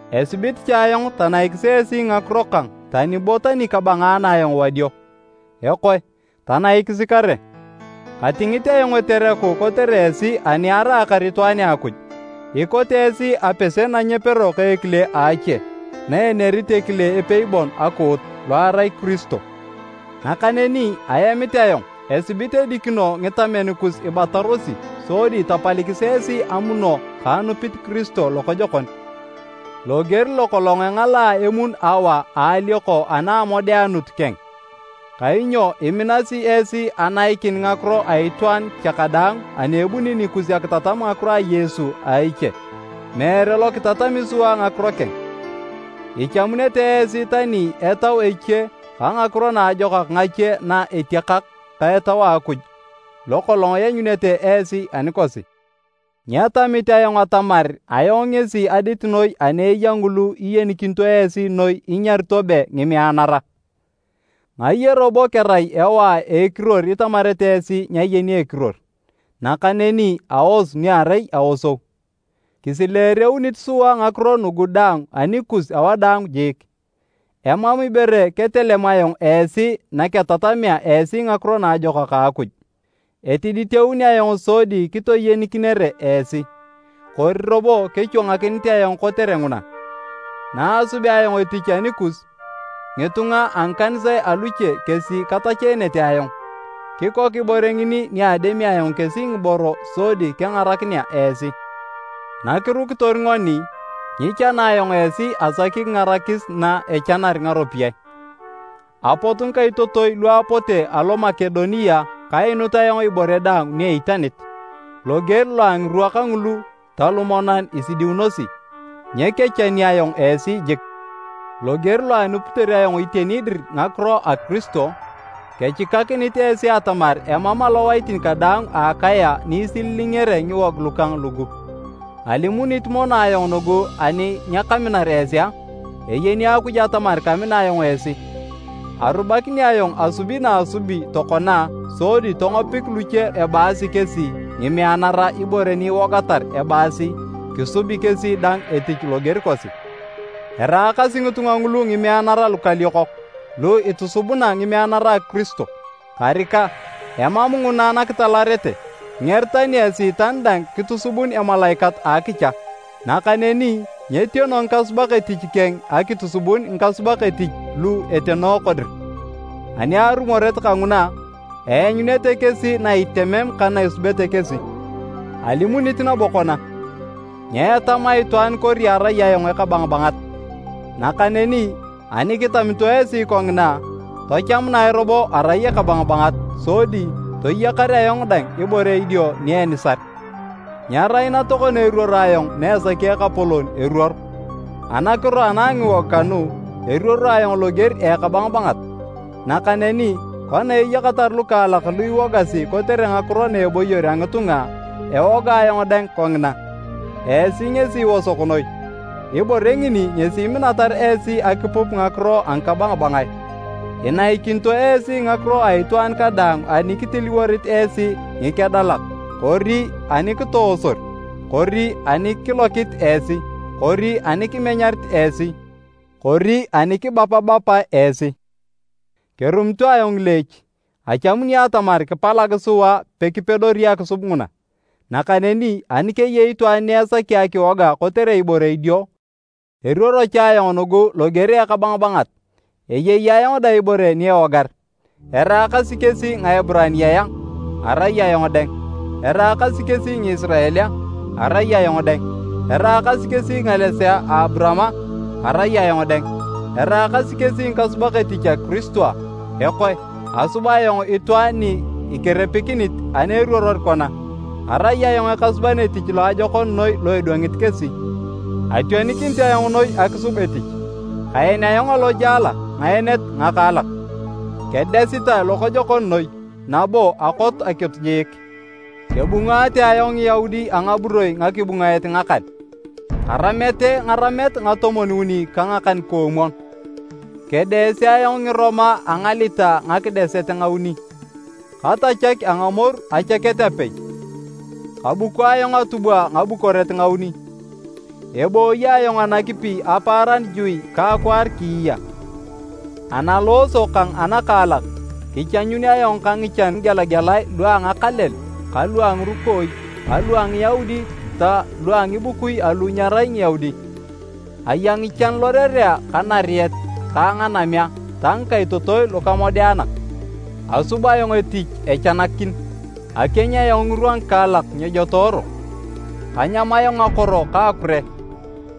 Esibit cha ayong tanaikis esi ngakiro kang tani bo tani kabangaana ayong wadio. Ekoe, tanaikisi kare! Katingit ayong etereku kotere esi ani araakar itwaan a Akuj. Ikote esi apese na nyepero ka ekile a ache, na enerit ekile epei bon akuut, lo erai Kiristo. Nakaneni aemit ayong esibit edikino ngitamen kus ibatarosi sodi tapalikis esi amuno ka anupit Kiristo lokojokon, loger lokolong engalaa emun Awa a alioko ana a amodeanut keng. Kainyo iminasi esi anaikin ngakiro a itwaan cha kadaang ani ebuni nikus akitatam ngakiro a Yesu a eche, meere lo kitatami sua ngakiro keng. Ichamunete esi tani etau eche ka ngakiro naajokak ngache na etiakak ka Etau a Akuj lokolong ianyunete esi anikosi! Nyetamit ayong atamar ayong ngesi adit noi ani eya ngulu iyenikinito esi noi inyarito be “ngimeanara!” Ngaye robo kerai ewae a ekiruor itamarete esi nyayeni ekiruor, nakaneni aos ni erai aosou. Kisileereunit sua ngakiro nugu daang anikus awadaang jiik. Emam ibore ketelem ayong esi naketatamea esi Ngakiro Naajokak a Akuj. Etiditeun ayong sodi kitoyenikinere esi. Kori robo kechwangakinit ayong kotere nguna? Naasubea ayong etich anikus, ngitunga a ngikanisae aluche kesi katacheenete ayong. Kikok ibore ngini ni ademi ayong kesi ngiboro sodi kengarakinea esi. Nakirukitor ngoni, nyichana ayong esi asaki kingarakis na echenar ngaropiyae. Apot ngikaitotoi lu apote alo Makedonia kainut ayong ibore daang ni eitanit. Loger lo a ngirwa kangulu ta lumonan isidiunosi, nyekechani ayong esi jik! Loger lo anupitor ayong iteni dir ngakiro na Kiristo, kechikakinit esi atamar emam alowaitin kadaang a Akaya ni isililingere ngiwog lukang lugu. Alimunit mono ayong nugu ani nyakaminar esi a? Eyeni Akuj atamar kamina ayong esi! Arubakini ayong asubi naasubi tokona sodi tongopik luche ebaasi kesi, “ngimeanara” ibore ni iwogatar ebaasi kisubi kesi dang etich loger kosi. Eraakasi ngitunga ngulu ngimeanara lukaliokok lu itusubuna ngimeanara a Kiristo. Karika, emam nguna nakitalarete! Nger tani Esiitan dang kitusubun emalaikat a akicha! Nakaneni nyetiono ngikasubak etich keng akitusubun ngikasubak etich lu etenooko dir. Ani arumoret kanguna, eanyunete kesi na itemem kana esubete kesi. Alimunit nabo kona, nyeetama itwaan kori arai ayong ekabangabangat. Nakaneni ani kitamito esi kongina, tachamunae robo arai ekabangabangat sodi toyakar ayong dang ibore idio ni enisar. Nyerai na tokona eruoro ayong na esaki Ekapolon eruor. Anakiro ana ngiwog kanu, eruoro ayong loger a ekabangabangat. Nakaneni kona eyakatar lukaalak lu iwogasi kotere ngakiro na eboyor a ngitunga, ewoga ayong dang kongina. Esi ngesi iosok noi, ibore ngini ngesi iminatar esi akipup ngakiro a ngikabangabangae! Inaikinito esi ngakiro a itwaan kadaang ani kitiliworit esi ngikedalak kori ani kitoosor kori ani kilokit esi kori ani kimenyarit esi kori ani kibapabapae esi. Kerumito ayong ngileech achamuni atamar kipalag sua pekipedori akisub nguna! Nakaneni ani keyei itwaan ni esaki akiwoga kotere ibore idio, eruoro cha ayong nugu loger a ekabangabangat, eyei ayong dang ibore ni ewogar. Eraakasi kesi Ngieburaniae a? Arai ayong dang. Eraakasi kesi Ngisirael a? Arai ayong dang. Eraakasi kesi ngalesea ka Aburaam a? Arai ayong dang. Eraakasi kesi ngikasubak etich a Kiristo a? Ekoe asub ayong itwaan ni ikerepikinit ani eruoror kona! Arai ayong ekasuban etich loajokon noi lo edwangit kesi! Ationikinit ayong noi akisub etich, kaen ayong alojala ngaenet ngakaalak, kedesitae lokojokon noi, nabo akot akitu jiik. Kebungaare ayong Ngiyaudi a ngaburoi ngakibungaet ngakan, karamete ngaramet ngatomwon-uni ka ngakan-koomwon. Kedeese ayong Ngiroma a ngalita ngakideset ngauni. Katachak a ngamoru achaket apei. Kabuko ayong atubwa ngabukoret ngauni. Ebooyi ayong anakipi apaaran juui ka akwaar kiiya. Analooso kang anakaalak, kichanyuunun ayong ka ngichan ngigelagelae lua ngakalel ka lua ngirukooi ka lua a Ngiyaudi ta lua ngibukui lu nyerai Ngiyaudi. Aya ngichan lorerea ka nariet ka nganamea ta ngikaitotoi lukamodeanak. Asub ayong etich echanakin. Akieny ayong ngirwa ngikaalak nyejotooro. Kanyam ayong akoro ka akure.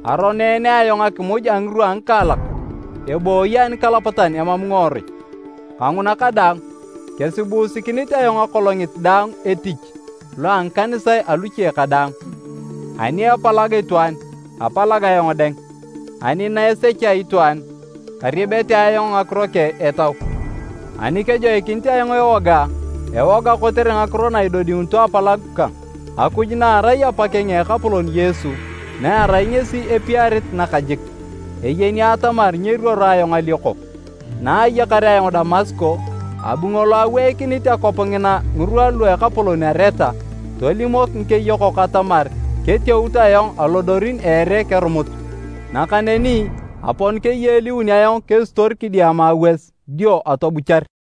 Aroneene ayong akimuj a ngirwa a ngikaalak ebooyi anikalapatan emam ngiworui. Kanguna kadaang, kesibuusikinit ayong akolongit daang etich lo a ngikanisae aluche kadaang. Ani epalag itwaan apalag ayong dang. Ani na esechea itwaan kariebete ayong ngakiro keng etau. Ani kejoikinit ayong ewoga, ewoga kotere ngakiro na idodiunito apalagu kang. Akuj na erai Apakeng a Ekapolon Yesu, na erai ngesi epiarit nakajik, eyeni atamar nyeruoro ayong alioko. Naayakar ayong Damasko, abu ngolo aweikinit akwap ngina ngirwa lua ekapolon Areta, tolimok ngikeyokok atamar keteut ayong alodorin a ere kerumut. Nakaneni apon keyeeliun ayong kesitor kidiama awas dio atobuchar.